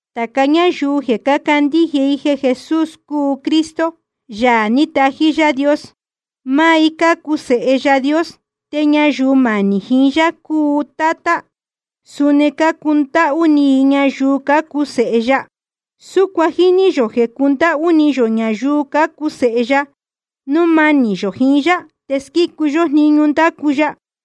Tāca ñáyuu jeē cácandíje i jeē Jesús cúu Cristo, Yaā ní tají Yaā Dios, máá i cácuu sēhe Yaā Dios. Te ñayuu manī jiín Yaā cúu Tátá, suni cácundáhú ni i ñayuu cácuu sēhe ya. Súcuan jíní yō jeē cundáhú ni yō ñayuu cácuu sēhe ya, núu manī yō jiín yá te squícu yó jniñu ndácu ya.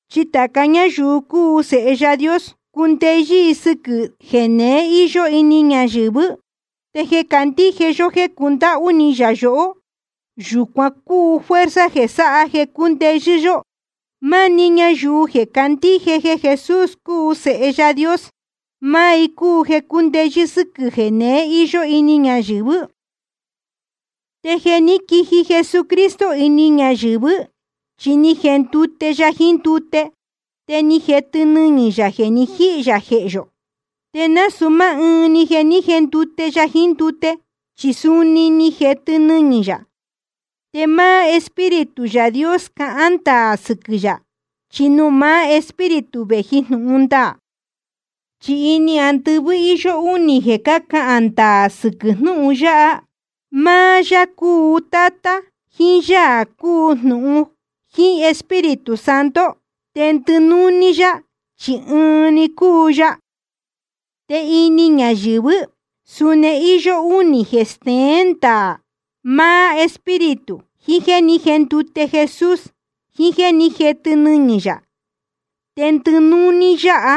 Chi tāca ñáyuu cúu sēhe Yaā Dios, cúndeyɨ́ i sɨquɨ̄ jeneé íyó ini ñayɨ̄vɨ́. Te jeē candíje yó jéē cundáhú ni yā yohó, yūcuan cúu fuerza jeē sáha jeē cúndeyɨ́ yó. Máá‑ni ñayuu jeē candíje jeē Jesús cúu Sēhe Yaā Dios, máá i cúu jeē cúndeyɨ́ sɨ́quɨ̄ jeneé íyó ini ñayɨ̄vɨ́. Te jeē ní quiji Jesucristo ini ñayɨ̄vɨ́, chi ni jendute ya jiín ndute, te ni jetɨ nɨñɨ̄ yā jeē ni jíhī yā jehē yō. Te nasūu máá ɨɨn‑ni jeē ní jendute ya jiín ndute, chi suni ni jetɨ nɨñɨ̄ yā. Te máá Espíritu Yaā Dios cahán ndaā sɨquɨ̄ yā, chi nuū maá Espíritu vēji jnūhun ndaā. Chi ini andɨvɨ́ íyó únī jeē cácahān ndaā sɨquɨ̄ jnúhun yáha: máá Yaā cúu Tátá, jiín Yaā cúu Jnūhun, jiín Espíritu Santo. Te ndɨnúní yá, chi ɨɨn‑ni cúu ya. Te ini ñayɨ̄vɨ́ suni íyó únī jeē steén ndaā: máá Espíritu, jiín jéē ní jendute Jesús, jiín jéē ní jetɨ nɨñɨ̄ yā. Te ndɨnúní yáha,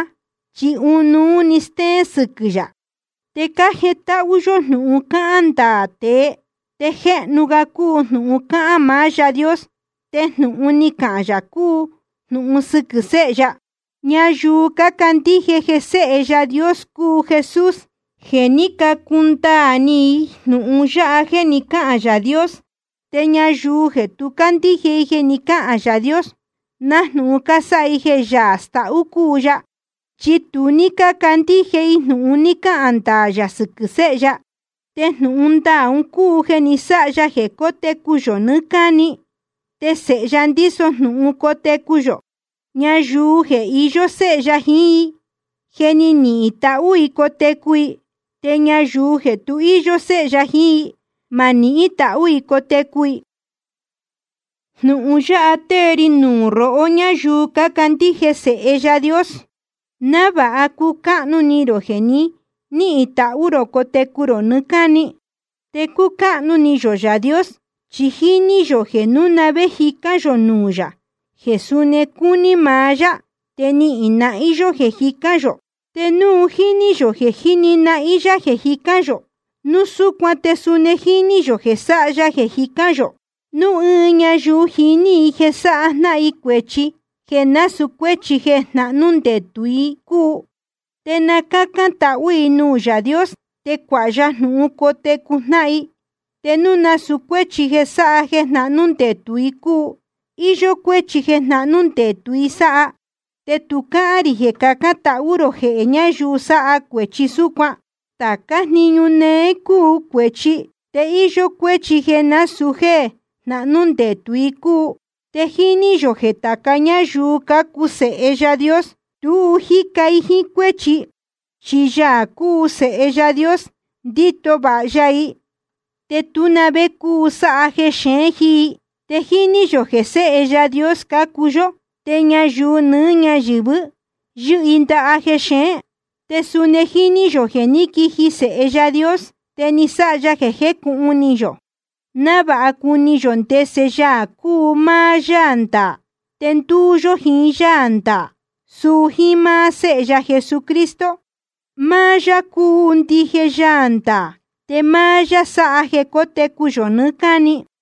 chi ɨnuú‑ni stéén sɨquɨ̄ yā. Te cájetáhú yó jnūhun cácahān ndaā tēe, te jéhnu ga cúu jnūhun cáhán maá Yaā Dios. Te jnūhun ni cahān yā cúu jnūhun sɨquɨ̄ Séhe ya. Ñayuu cácandíje jeē Sēhe Yaā Dios cúu Jesús, je ni cacundaā ni i jnūhun yáha jeē ni cáhān Yaā Dios. Te ñayuu jeē tu cácandíje jeē ni cáhān Yaā Dios, nájnūhun cásáha i jeē Yaā stahú cúu ya, chi tu cácandíje i jnūhun ni cahān ndaā yā sɨquɨ̄ Séhe ya. Te jnūhun ndaā un cúu jeē ni sáha ya jeē cótecu yō nɨɨ́ cáni, te Sēhe ya ndíso jnūhun cotecu yō. Ñayuu jeē iyó Séhe ya jiín i, je ni nihīn tahú i cotecu i. Te ñayuu jeē tu íyó Séhe ya jiín i, ma nihín tahú i cotecu i. Jnūhun yáha tée ri nuū rohó ñáyuu cácandíje Sēhe Yaā Dios, návāha cucáhnu ni rō jeē ni níhīn tahú rō cotecu rō nɨɨ́ cáni. Te cúcáhnu ni yō Yaā Dios, chi jíní yō jeē núu na vé jicán yō nuū yā jeē suni cúní maá yá, te jíni nahín yá jeē jicán yō. Te núu jíní yō jeē jíni nahín yá jeē jicán yō, núu súcuan te suni jíní yō jeē sáha ya jeē jicán yō. Núu ɨɨn ñayuu jiní i jeē sáha jnáhan i cuēchi jeē násūu cuéchi jeē jnahnú ndetū i cúu, te na cácán tahú i nuū Yaā Dios, te cuāha ya jnūhun cotecu jnáhan i, te núu nasūu cuéchi jeē sáha jeē jnahnú ndetū i cúu. Iyó cuéchi jeē jnahnú ndetū i sáha, te tu cáhán rī jeē cacán tahú rō jehē ñayuu sáha cuēchi súcuan. Tācá jniñu néé cúu cuēchi, te íyó cuéchi jeē násūu jéē jnahnú ndetū i cúu. Te jíní yō jeē tāca ñáyuu cácuu sēhe Yaā Dios, tu jíca i jíín cuéchi. Chi Yaā cúu Sēhe Yaā Dios, ndíto vāha ya i. Te tú na vé cúu sáha jexeén jiín i. Te jíní yō jeē séhe Yaā Dios cácuu yó. Te ñayuu nɨɨ́ ñáyɨ̄vɨ yɨ́hɨ i ndaha jexeén. Te suni jíní yō jeē ní quiji Sēhe Yaā Dios, te ni sáha ya jeē jécūhun ni yō, návāha cuni yō ndese Yaā cúu máá Yaā ndaā. Te ndúú yó jiín Yaā ndaā, suu jíín máá Séhe ya Jesucristo. Máá yá cúu ndije Yaā ndaā, te máá yá sáha jeē cótecu yō nɨɨ́ cáni.